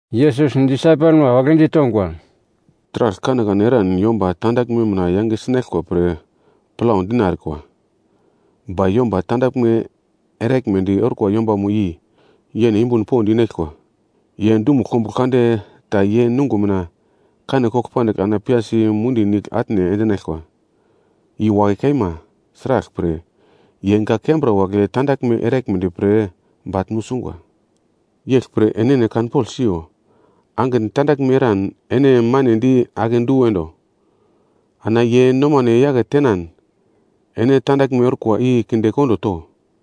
Yesus disaipelma wagle ditongwa, “Taragl kanekane eran yomba tandaglme mina yange sinaglkwa pre plau dina erikwa, ba yomba tandaglme eraglmedi orkwa yombamo i yene yumbun pond inaglkwa. Ye dumugl kombuglo kande ta ye nungo mina kane kogl pandigl ana piyasi mundi nigl atne endinaglkwa, i wakai kaima, sraglpre, ye gak kembra wagle tandaglme eraglmedi pre bagl nusungwa. “Yeglpre enene kanpogl siyo, angitn tandaglme eran ene manedi akedu endo. Ana ye nomane yake tenan, ene tandaglme orkwa i kinde kondo to.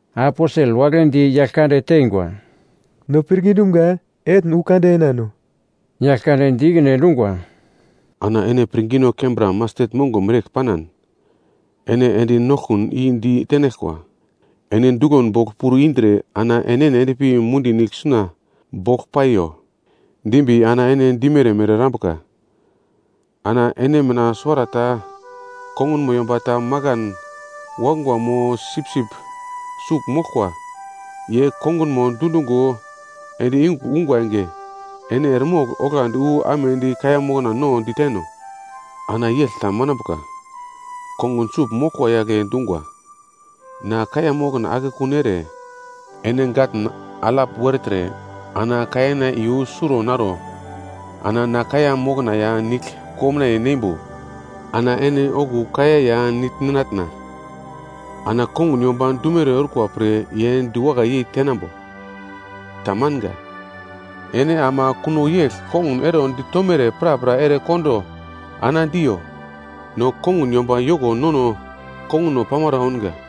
Aposel wagle di Yaglkande teingwa, “No pirngi dumga etn wu kande enano!” Yaglkande di ikine endungwa, “Ana ene pirngino kembra mastet mongo mereyegl panan, ene endi noglkun i di tenaglkwa, ‘Ene duglon bogl puro indre ana enene endpi mundi nigl suna bogl paiyo’ dimbi ana ene dimere mere erambuka. “Ana ene mina suwarata kongunmo yomba ta makan wakungwa mo sipsip sugl moglkwa, ye kongunmo dundungo ende yungugl ungwa enge. Ene eremogl, oglandi wu amedi kaiya mokna no, diteno? Ana yegl ta manambuka, kongun sugl moglkwa yagle dungwa, ‘Na kaiya mokna akekun ere, ene gatn alap wertre ana kaiyana iyu suro naro ana na kaiya mokna ya nigl komnaiye neimbo ana ene okuwo kaiya ya nigl ninatna.’ Ana kongun yomba dumere orkwa pre ye diwakai yei tenambo? Tamanga. Ene ama kuno yegl kongun ero ditomere prapra ere kondo ana diyo, ‘No kongun yomba yoko nono konguno pamara ounga.’”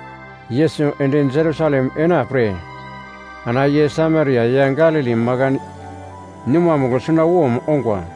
Yesus ende Jerusalem ena pre ana ye Samaria ya Galili makan numamugl sunawom ongwa.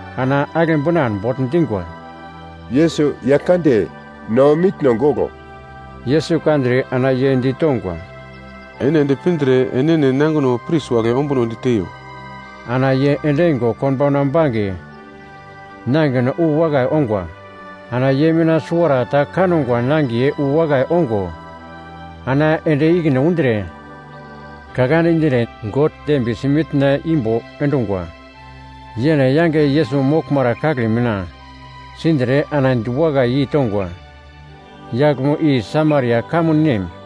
ana agle binan bogl dingwa, “Yesus Yaglkande, no mitno goglo.” Yesus kandre ana ye ditongwa, “Ene ende pindre enene nangino pris wagle ombunodi teiyo.” Ana ye endingo konbauna bange nangino wu wakai ongwa. Ana ye mina suwarata kangwa nangiye wu wakai ongo ana ende ikine undre, ka kande dindre God dembiyesi mitna imbo endungwa. Yene yange Yesus moglmara kagle mina sindre ana diwakai yeitongwa. Yaglmo i Samaria kamun nem.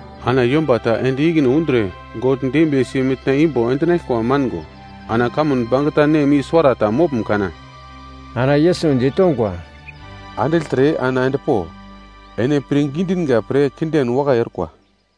Ana yomba ta ende ikine undre God dembiyesi mitna imbo endinaglkwa mango, ana kamun bangeta nem i suwarata moglm kana?” Ana Yesus ditongwa, “Andigltre, ana endpo, ene pirngi dinga pre kinden wakai orkwa.”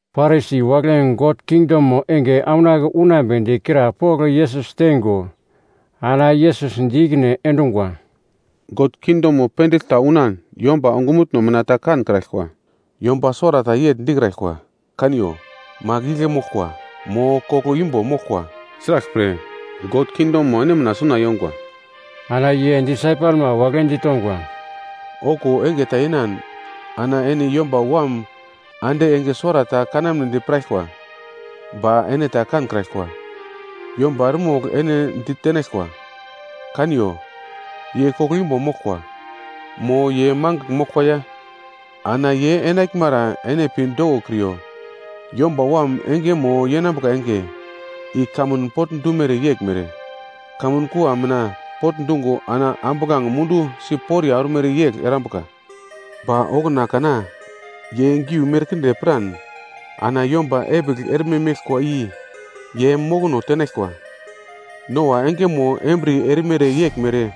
Parisi wagle God kingdomo enge aunake unambedi krapogl Yesus teingo, ana Yesus di ikine endungwa, “God kingdomo pendigl ta unan yomba ongumutno mina ta kankraglkwa. Yomba suwarata yegl dikraglkwa, ‘Kaniyo. Magl igle moglkwa,’ mo ‘Koglo imbo moglkwa.’ Sraglpre, God kingdomo ene mina suna yongwa.” Ana ye disaipelma wagle ditongwa, “Okuwo enge ta yenan ana ene Yomba Wam ande enge suwarata kanamnedi piraglkwa, ba ene ta kankraglkwa. Yomba eremogl ene ditenaglkwa, ‘Kaniyo, ye koglo imbo moglkwa,’ mo ‘Ye mangigl moglkwa ya.’ Ana ye enaglmara ene pi dokokriyo. Yomba Wam engemo yenambuka enge, i kamun potndumere yeglmere, kamun kua mina pogl dungo ana ambuglange mundu si poriya ormere yegl erambuka. Ba okuna kana ye giu merkinde piran ana yomba epigl erme meglkwa i ye mokono tenaglkwa. “Noa engemo embriye erimere yeglmere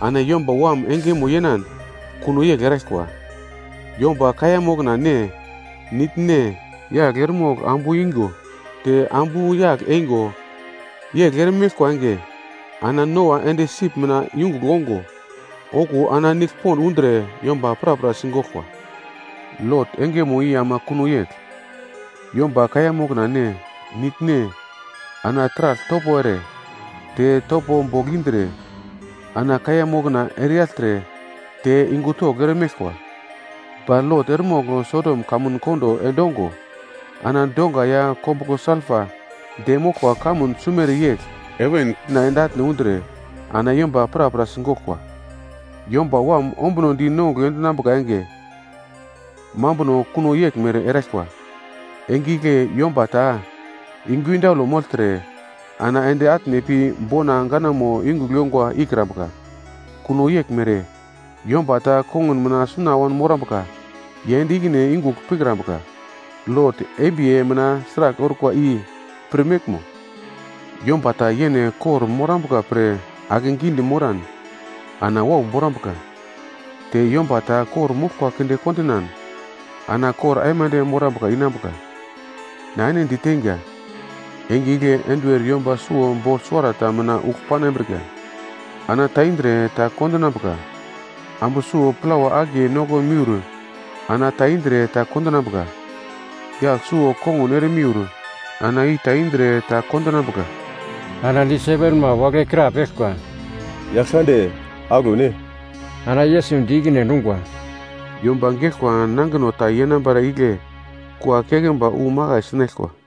ana Yomba Wam engemo yenan kuno yegl eraglkwa. Yomba kaiya mokna ne, nigl ne, yagl eremogl ambu ingo te ambu yagl eingo, yegl ere meglkwa enge, ana Noa ende sip mina yungugl ongo, okuwo ana nigl pond undre yomba prapra sigoglkwa. “Lot engemo i ama kuno yegl. Yomba kaiya mokna ne, nigl ne, ana taragl topo ere, te topo bogl indre, ana kaiya mokna ereyagltre te yungu togl eremeglkwa. Ba Lot eremogl Sodom kamun kondo endongo, ana donga ya kombuglo salpa de moglkwa kamun sumere yegl, heven ende atne undre ana yomba prapra sigoglkwa. “Yomba Wam ombunodi unongugl enambuka enge, mambuno kuno yeglmere eraglkwa. Enge igle yomba ta yungu indaule mogltre ana ende atne pi bona ganamo yungugl yongwa ikrambuka, kuno yeglmere yomba ta kongun mina suna wanmorambuka ye ende ikine yungugl pikrambuka. Lot embiye mina sragl orkwa i pirmeglmo! Yomba ta yene kor-morambuka pre akegidi moran, ana wau borambuka, te yomba ta kor-moglkwa kinde kondinan ana kor aimande morambuka inambuka. Na ene diteinga, enge igle enduwer yomba suwo bogl suwarata mina ugl panambrika, ana ta indre ta kondinambuka. Ambu suwo plawa akiye noko miur ana ta indre ta kondinambuka. Yagl suwo kongun ere miur ana i ta indre ta kondinambuka.” Ana disaipelma wagle krapeglkwa, “Yaglkande, aglo ne?” Ana Yesus di ikine endungwa, “Yomba geglkwa nangino ta yenambara igle kua keglmba wu makai sinaglkwa.”